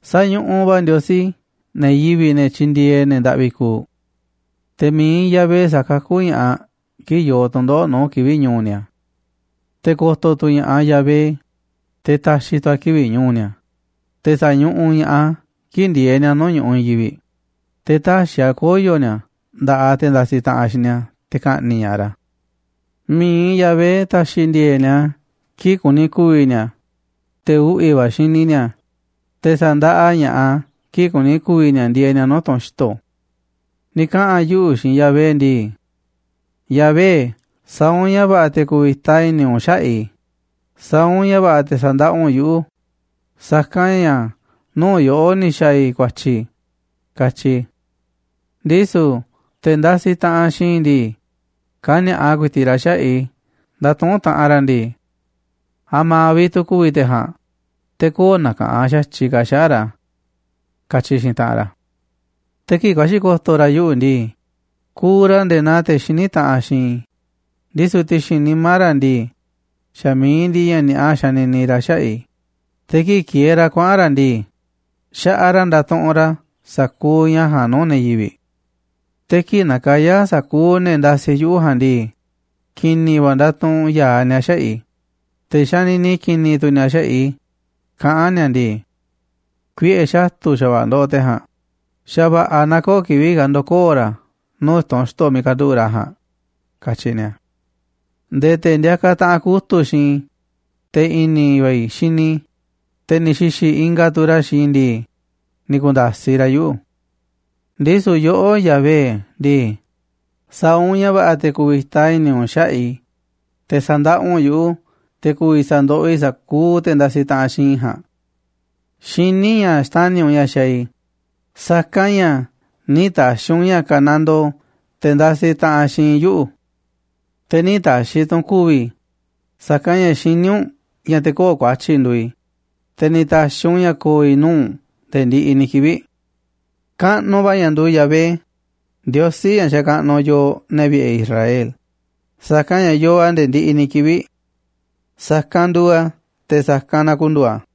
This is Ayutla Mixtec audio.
Sañuꞌuꞌ va̱ Ndiosí ne̱ yivi̱ꞌ, ne̱ tyindieeꞌ ne̱ ndaꞌvi kuuꞌ. Te̱ mi̱iꞌ Yahvé sa̱kakú ña̱ꞌaꞌ kii̱ꞌ yoo tu̱ndoꞌo̱ꞌ nuu̱ꞌ kivi̱ꞌ ñu̱u̱ ni̱a̱. Te̱ ko̱to̱ tu̱ ña̱ꞌaꞌ Yahvé, te̱ ta̱xi̱ tu̱ a̱ kivi̱ꞌ ñu̱u̱ ni̱a̱, te̱ sa̱ñuꞌuꞌ ña̱ꞌaꞌ a̱ kii̱ꞌ ndieeꞌ ni̱a̱ nuu̱ꞌ ñu̱ꞌuꞌ i̱i̱n yivi̱ꞌ, te̱ tä̱xi̱ a̱ koyo̱ ni̱a̱ nda̱ꞌaꞌ te̱ ndasiꞌ taꞌanꞌ xiinꞌ ni̱a̱ te̱ ka̱ꞌni̱ꞌ ña̱ꞌaꞌ ra̱. Mi̱iꞌ Yahvé ta̱xi̱ ndi̱e̱e̱ꞌ ni̱a̱ kii̱ꞌ kuni ku̱vi̱ ni̱a̱, te̱ uꞌvi̱ va̱ xini ni̱a̱, te̱ sa̱ndaꞌa ña̱ꞌaꞌ a̱ kii̱ꞌ kuni ku̱vi̱ ni̱a̱ ndieeꞌ ni̱a̱ nuu̱ꞌ tunꞌ xi̱to̱. Ni̱ kaꞌa̱n yuꞌu̱ xiinꞌ Yahvé ndii: “Yahvé, sa̱a̱ u̱nꞌ ña̱ va̱ꞌa̱ te̱ ku̱vi̱ta i̱ni̱ u̱nꞌ xaꞌa̱ꞌ i̱, sa̱a̱ u̱nꞌ ña̱ va̱ꞌa̱ te̱ sa̱ndaꞌa u̱nꞌ yuꞌu̱, sa̱kanꞌ ña̱ nuu̱ꞌ yoꞌó ni̱ xa̱a̱ i̱ ku̱a̱tyi̱”, katyi i̱. Ndisu̱ te̱ ndasiꞌ taꞌanꞌ xiinꞌ i̱ ndii, kani̱a̱ꞌa ku̱i̱ti̱ꞌ ra̱ xaꞌa̱ꞌ i̱ ndatuꞌúnꞌ taꞌanꞌ ra̱ ndii: “¿A̱ma̱ vi̱ꞌ tu̱ ku̱vi̱ te̱ ja̱a̱nꞌ, te̱ köo̱ꞌ na̱ka̱ꞌanꞌ xa̱tyiꞌ ka̱ xaꞌa̱ꞌ ra̱?”, katyi xiinꞌ taꞌanꞌ ra̱. Te̱ kii̱ꞌ ku̱a̱xi̱ ko̱to̱ ra̱ yuꞌu̱ ndii, kuuꞌ ra̱ nde̱e̱ naa te̱ xiní taꞌanꞌ xiinꞌ i̱, ndisu̱ ti̱xi̱n nimá ra̱ ndii, xa̱ mi̱iꞌ ndiꞌiꞌ ña̱ ni̱a̱ꞌa xanini ra̱ xaꞌa̱ꞌ i̱. Te̱ kii̱ꞌ kieeꞌ ra̱ kuaꞌa̱n ra̱ ndii, xaꞌaꞌ ra̱ ndatuꞌunꞌ ra̱ sa̱kuuꞌ ña̱ ja̱a̱nꞌ nuu̱ꞌ ne̱ yivi̱ꞌ. Te̱ kii̱ꞌ nakayá sa̱kuuꞌ ne̱ ndasiꞌ yuꞌu̱ ja̱a̱nꞌ ndii, ki̱ni̱ va̱ ndatuꞌunꞌ ya̱aꞌ ni̱a̱ xaꞌa̱ꞌ i̱, te̱ xanini ki̱ni̱ tu̱ ni̱a̱ xaꞌa̱ꞌ i̱, kaꞌán ni̱a̱ ndii: “Kuiꞌe̱ xatu̱ xa̱va̱ꞌa̱ ndoꞌoꞌ te̱ ja̱a̱nꞌ, xa̱va̱ꞌa̱ na köo̱ꞌ kivi̱ꞌ ka̱ ndo̱koo̱ ra̱ nuu̱ꞌ tunꞌ xto̱ miiꞌ kanduꞌu̱ꞌ ra̱ ja̱a̱nꞌ”, katyi ni̱a̱. Nde̱e̱ te̱ ndiakaꞌ taꞌanꞌ kutu̱ꞌ xiinꞌ i̱, te̱ i̱ni̱ va̱ i̱ xini i̱, te̱ ni̱ xi̱xi̱ ingaꞌ tu̱ ra̱ xiinꞌ i̱ ndii, ni̱ ku̱nda̱siꞌ ra̱ yuꞌu̱. Ndisu̱ yoꞌó, Yahvé ndii, sa̱a̱ u̱nꞌ ña̱ va̱ꞌa̱ te̱ ku̱vi̱ta i̱ni̱ u̱nꞌ xaꞌa̱ꞌ i̱, te̱ sa̱ndaꞌa u̱nꞌ yuꞌu̱, te̱ ku̱vi̱ sa̱ndoꞌoꞌ i̱ sa̱kuuꞌ te̱ ndasiꞌ taꞌanꞌ xiinꞌ i̱ ja̱a̱nꞌ. Xiní i̱ ña̱ xtani̱ u̱nꞌ ña̱ xaaꞌ i̱, sa̱kanꞌ ña̱ nï̱ ta̱xi̱ u̱nꞌ ña̱ kanandoo te̱ ndasiꞌ taꞌanꞌ xiinꞌ yuꞌu̱. Te̱ nï̱ ta̱xi̱ tu̱ u̱nꞌ ku̱vi̱ i̱, sa̱kanꞌ ña̱ xiní u̱nꞌ ña̱ te̱ köo̱ꞌ ku̱a̱tyi̱ nduuꞌ i̱, te̱ ni̱ ta̱xi̱ u̱nꞌ ña̱ ko̱o̱ i̱ nuu̱ꞌ u̱nꞌ nde̱e̱ ndiꞌiꞌ ni̱ kivi̱ꞌ. Kaꞌnuꞌ va̱ ña̱ nduuꞌ Yahvé, Ndiosí ña̱ xakaꞌnuꞌ yooꞌ, ne̱ vi̱ꞌe̱ Israel, sa̱kanꞌ ña̱ yoo a̱ nde̱e̱ ndiꞌiꞌ ni̱ kivi̱ꞌ. Sa̱kanꞌ nduuꞌ a̱, te̱ sa̱kanꞌ na ku̱ndu̱u̱ a̱.